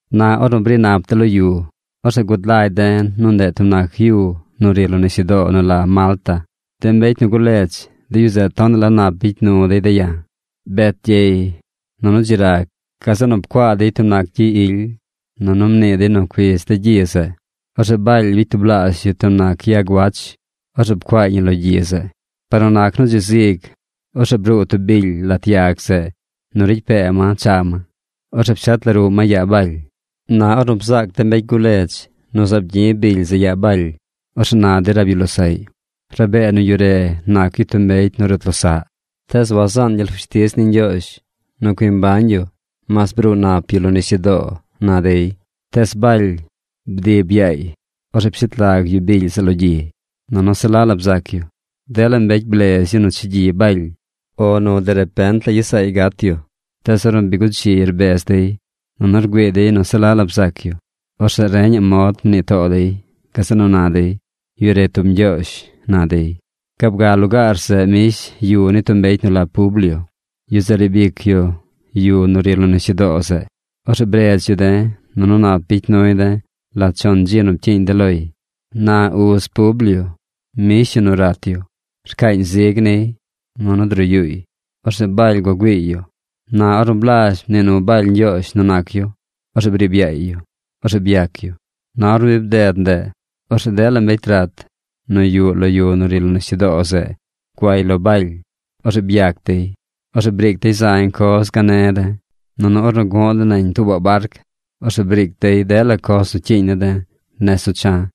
Na ornu bri̱ nap de̱ lo yu, orzeꞌ gud lagy de̱ nu ndeꞌ tub nac yu nu ri lo nisyudoo nu la Malta. De mbecy nu guledz, de yu zeꞌ tonaꞌ la nap bicy nu dey de̱ ya̱. Bet gyey, nunu dzi rag. Gazeꞌ nu pcuaa dey tub nac gyi ily, nunu mnii dey nu cuidz de̱ gyi zeꞌ. Orzeꞌ Baly bicy tublaazh yu tub nac yag wach. Orzeꞌ pcuaay ñi lo gyi zeꞌ. Par nu nac nu dzi zig, orzeꞌ bruu tub bily lat yag zeꞌ nu ricy pee ma cha ma. Orzeꞌ pshet la ruꞌ ma yaa Baly. Na ornu bzaac de mbecy guledz nu zaab gyi̱ bily zeꞌ yaa Baly. Orzeꞌ na dey rab yu losaꞌy: ―Rabee nu yu re nac yu tub mbecy nu rut losaꞌ. Tees wasaan gyel fushtiz ni Ñgyoozh nu cui mbañ yu mas bruu nap yu lo nisyudoo ―na dey. Tees Baly bdib yaay. Orzeꞌ pshet lag yu bily zeꞌ lo gyi. Nunu se la la bzac yu. Dela mbecy blez yu nu chegyi Baly o nu derepent la gyes saay gat yu. Tees ornu bi guchi rbez dey, nunu rgüii dey nu se la la bzac yu, orzeꞌ reñaꞌ mod mnii too dey. Gazeꞌ nu na dey: ―Yu re tub ñgyoozh ―na dey. Gaab ga lugaar zeꞌ mbish yu ni tub mbecy nu la Publio, yu zeꞌ riib ic yu yu nu ri lo nisyudoo zeꞌ. Orzeꞌ bredz yu de̱, nunu nap bicy nuy de̱ lat chon dzi nu pcyiiñ de̱ loy. Na uz Publio mbish yu nu rat yu. Rcaañ zig niy, nunu druyuuy. Orzeꞌ Baly gua güiiy yu. Na ornu blazh mnii nu Baly Ñgyoozh nu nac yu, orzeꞌ briib yaay yu. Orzeꞌ byac yu. Na ornu bi bded ndeꞌ, orzeꞌ dela mbecy rat nu yuꞌ lo yu nu ri lo nisyudoo zeꞌ guay lo Baly. Orzeꞌ byac dey. Orzeꞌ briic dey zañ coz gane̱ de̱. Nunu ornu gu̱ꞌ de̱ nañ tuubaꞌ barc, orzeꞌ briic dey dela coz nu cyiiñ ne̱ de̱ nez nu cha̱.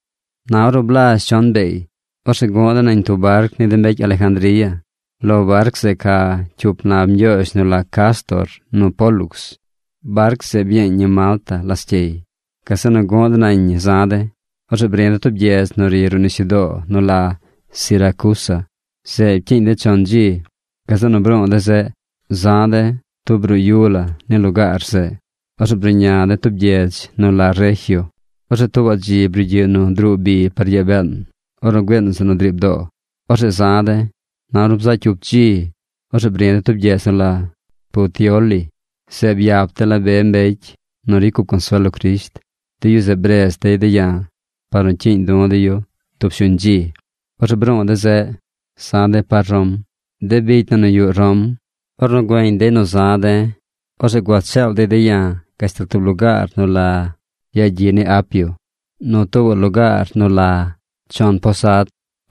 Na ornu blazh chon beey, orzeꞌ gu̱ꞌ de̱ nañ tub barc ni de mbecy Alejandría. Lo barc zeꞌ ca cyup nab ñgyoozh nu la Cástor nu Pólux. Barc zeꞌ byeeñ ñi Malta lascyey. Gazeꞌ nu gu̱ꞌ de̱ nañ ñi za̱ de̱. Orzeꞌ bri̱ de̱ tub gyedz nu ri ruꞌ nisyudoo nu la Siracusa. Zeꞌ pcyiiñ de̱ chon dzi. Gazeꞌ nu bru̱u̱ de̱ zeꞌ. Za̱ de̱ tub ruꞌ yu la ni lugaar zeꞌ. Orzeꞌ bruꞌña de̱ tub gyedz nu la Regio. Orzeꞌ tuubaꞌ dzi brugyiꞌ nu druu bi par yaa been ornu güiin zeꞌ nu driib doo. Orzeꞌ za̱ de̱. Na ornu bzaꞌ cyup dzi, orzeꞌ bri̱ de̱ tub gyedz nu la Puteoli. Zeꞌ byap de̱ la be mbecy nu ricy cup consuel lo Crisht. De yu zeꞌ bredz dey de̱ ya̱ par nu cyiiñ du̱ de̱ yu tub shuñ dzi. Orzeꞌ bru̱u̱ de̱ zeꞌ. Za̱ de̱ par Rom. De bicy na nu yuꞌ Rom, ornu güeñ dey nu za̱ de̱, orzeꞌ gua cheel dey de̱ ya̱ gashtal tub lugaar nu la Yagyiꞌ ni Apio, nu tuubaꞌ lugaar nu la Chon Posad.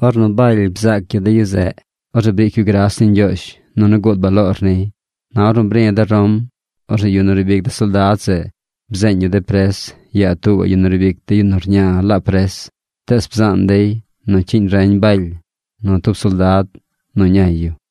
Ornu Baly bzaac yu de yu zeꞌ, orzeꞌ briic yu gras ni Ñgyoozh, nunu gud baloor niy. Na ornu bri̱ de̱ Rom, orzeꞌ yu nu riib ic de soldad zeꞌ bzeeñ yu de pres yaa tuubaꞌ yu nu riib ic de yu nu rña laab pres. Tees bzaan dey nu cyiiñ reñ Baly nu tub soldad nu ñay yu.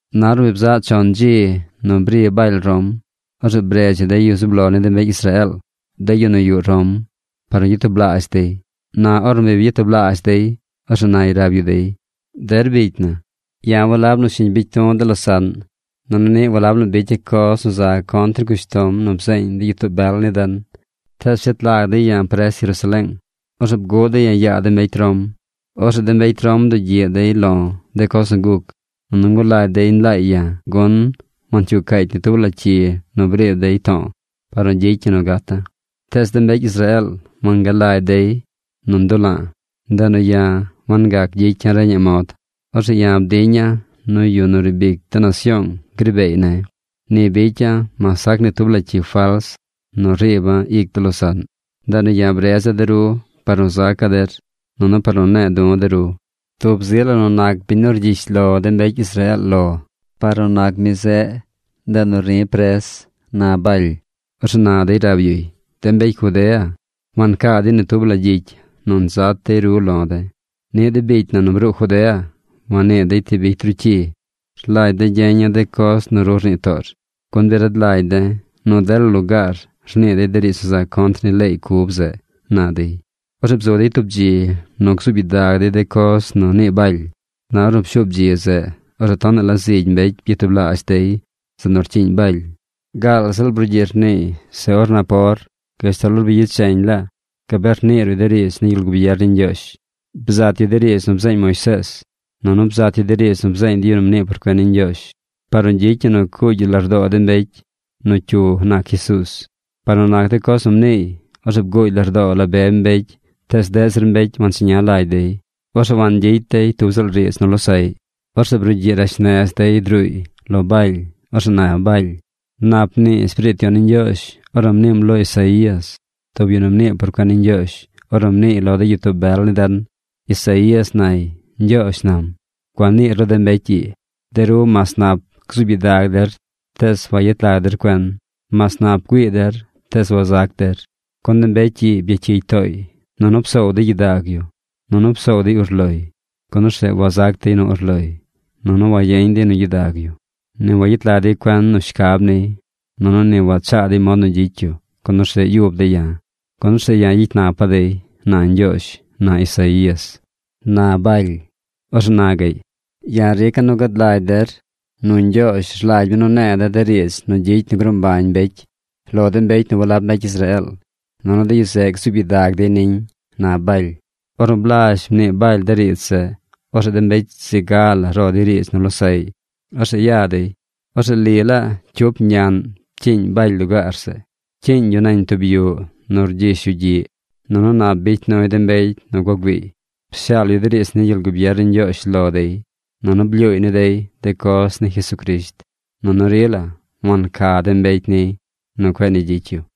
Na ornu bi bzaꞌ chon dzi nu bri Baly Rom, orzeꞌ bredz yu de yu zub lo ni de mbecy Israeel, de yu nu yuꞌ Rom par nu gyatublaazh dey. Na ornu bi byatublaazh dey, orzeꞌ nay rab yu dey: ―Der bicy na, ya̱ walab nu shiñ bicy du̱ de losaꞌn, nunu niꞌ walab nu bicya̱ coz nu za contr ni cushtom nu bzeeñ de gyitoo bel ni den, tees pshet lag dey ya̱ pres Jerusaleeng. Orzeꞌ bguꞌ dey ya̱ yaa de mbecy Rom. Orzeꞌ de mbecy Rom bdugyiꞌ dey lo̱ de coz nu guc, nunu ngulagy dey nlaay ya̱, gun wancyuu caacy ni tub la cyi nu briib dey to̱o̱ par nu gyicy ñi nu gata̱. Tees de mbecy Israeel wangalagy dey nu ndula̱a̱. Ndeꞌ nu ya̱ wangac gyicya̱ reñaꞌ mod. Orzeꞌ ya̱ bdiña̱ nu yu nu riib ic de nasyoong gri beey ne̱. Ni bicya̱ mas sac ni tub la cyi fals nu riiba̱ ic de losaꞌn. Ndeꞌ nu ya̱ bredza̱ de ru par nu zaca̱ der, nunu par nu ne̱e̱ du̱ de ru. Tub zi la nu nac biñ nu rgyish lo de mbecy Israeel lo, par nu nac mi zeꞌ, ndeꞌ nu ri̱ pres ―na Baly. Orzeꞌ na dey rab yuy: ―De mbecy Judea wancaa dey ni tub la gyicy nu nzat dey ru lo̱ de̱. Niꞌ de bicy na nu bruu Judea wannii dey ti bicy ru cyi. Rlagy de̱ gyeña̱ de coz nu ru rnii toor, gun bi rad lagy de̱ nu dela lugaar rnii dey riidz nu za contr ni leey cub zeꞌ ―na dey. Orzeꞌ bzu dey tub dzi nu gzuub gyidag dey de coz nu nii Baly. Na ornu pshuub dzi zeꞌ, orzeꞌ tonaꞌ la zigy mbecy byatublaazh dey zeꞌ nu rcyiiñ Baly. Gaal ziꞌl brugyiꞌ rniiy se or napor gashtal or bicheñ laa gabee rnii ruꞌy de riidz ni gyel gubier ni Ñgyoozh. Bzat yu de riidz nu bzeeñ Moisees, nunu bzat yu de riidz nu bzeeñ de yu nu mnii por cuen ni Ñgyoozh par nu gyicy ñi nu cuugy yu lardoo de mbecy nu cyu nac Jesuuz. Par nu nac de coz nu mniiy, orzeꞌ bguugy lardoo la be mbecy tees deꞌ zir mbecy wancheña lagy dey. Orzeꞌ wangyicy dey tub ziꞌl riidz nu losaꞌy. Orzeꞌ brugyiꞌ rash nez dey druuy lo Baly. Orzeꞌ na Baly: ―Nap mnii Espiriit Yon ni Ñgyoozh ornu mniim lo Isaías, tub yu nu mnii por cuen ni Ñgyoozh, ornu mniiy lo de gyitoo bel ni den. Isaías nay: Ñgyoozh nam: “Gua niir lo de mbecy ii. De ru mas nap gzuub gyidag der tees wayet lag der cuen. Mas nap güii der tees wazac der. Gun de mbecy ii byacyigy tooy. Nunu psoow dey gyidag yu. Nunu psoow dey urloy, gun orzeꞌ wazac dey nu urloy, nunu wagyeñ dey nu gyidag yu. Ni wayet lag dey cuen nu shcab niy. Nunu ni wachaa dey mod nu gyicy yu, gun orzeꞌ yub dey ya̱. Gun orzeꞌ ya̱ gyicy napa̱ dey”, na Ñgyoozh, na Isaías ―na Baly. Orzeꞌ na gaꞌy: ―Ya̱ rica̱ nu gad lagy der nu na Ñgyoozh rlagy mi nu ne̱e̱ de̱ de riidz nu gyicy nu gruu mbañ mbecy lo de mbecy nu walab mbecy Israeel. Nunu de yu zeꞌ gzuub gyidag dey niñ ―na Baly. Ornu blazh mnii Baly de riidz zeꞌ, orzeꞌ de mbecy zi ga la ro dey riidz nu losaꞌy. Orzeꞌ ya dey. Orzeꞌ li laa cyup ñaꞌn pcyiiñ Baly lugaar zeꞌ. Pcyiiñ yu nañ tub yuꞌ nu rgyish yu gyiꞌ. Nunu nap bicy nuy de mbecy nu gua güiiy. Pshaal yu de riidz ni gyel gubier ni Ñgyoozh lo dey, nunu blyuuy ni dey de coz ni Jesucrisht. Nunu rila wanca de mbecy niy nu cueꞌ ni gyicy yu.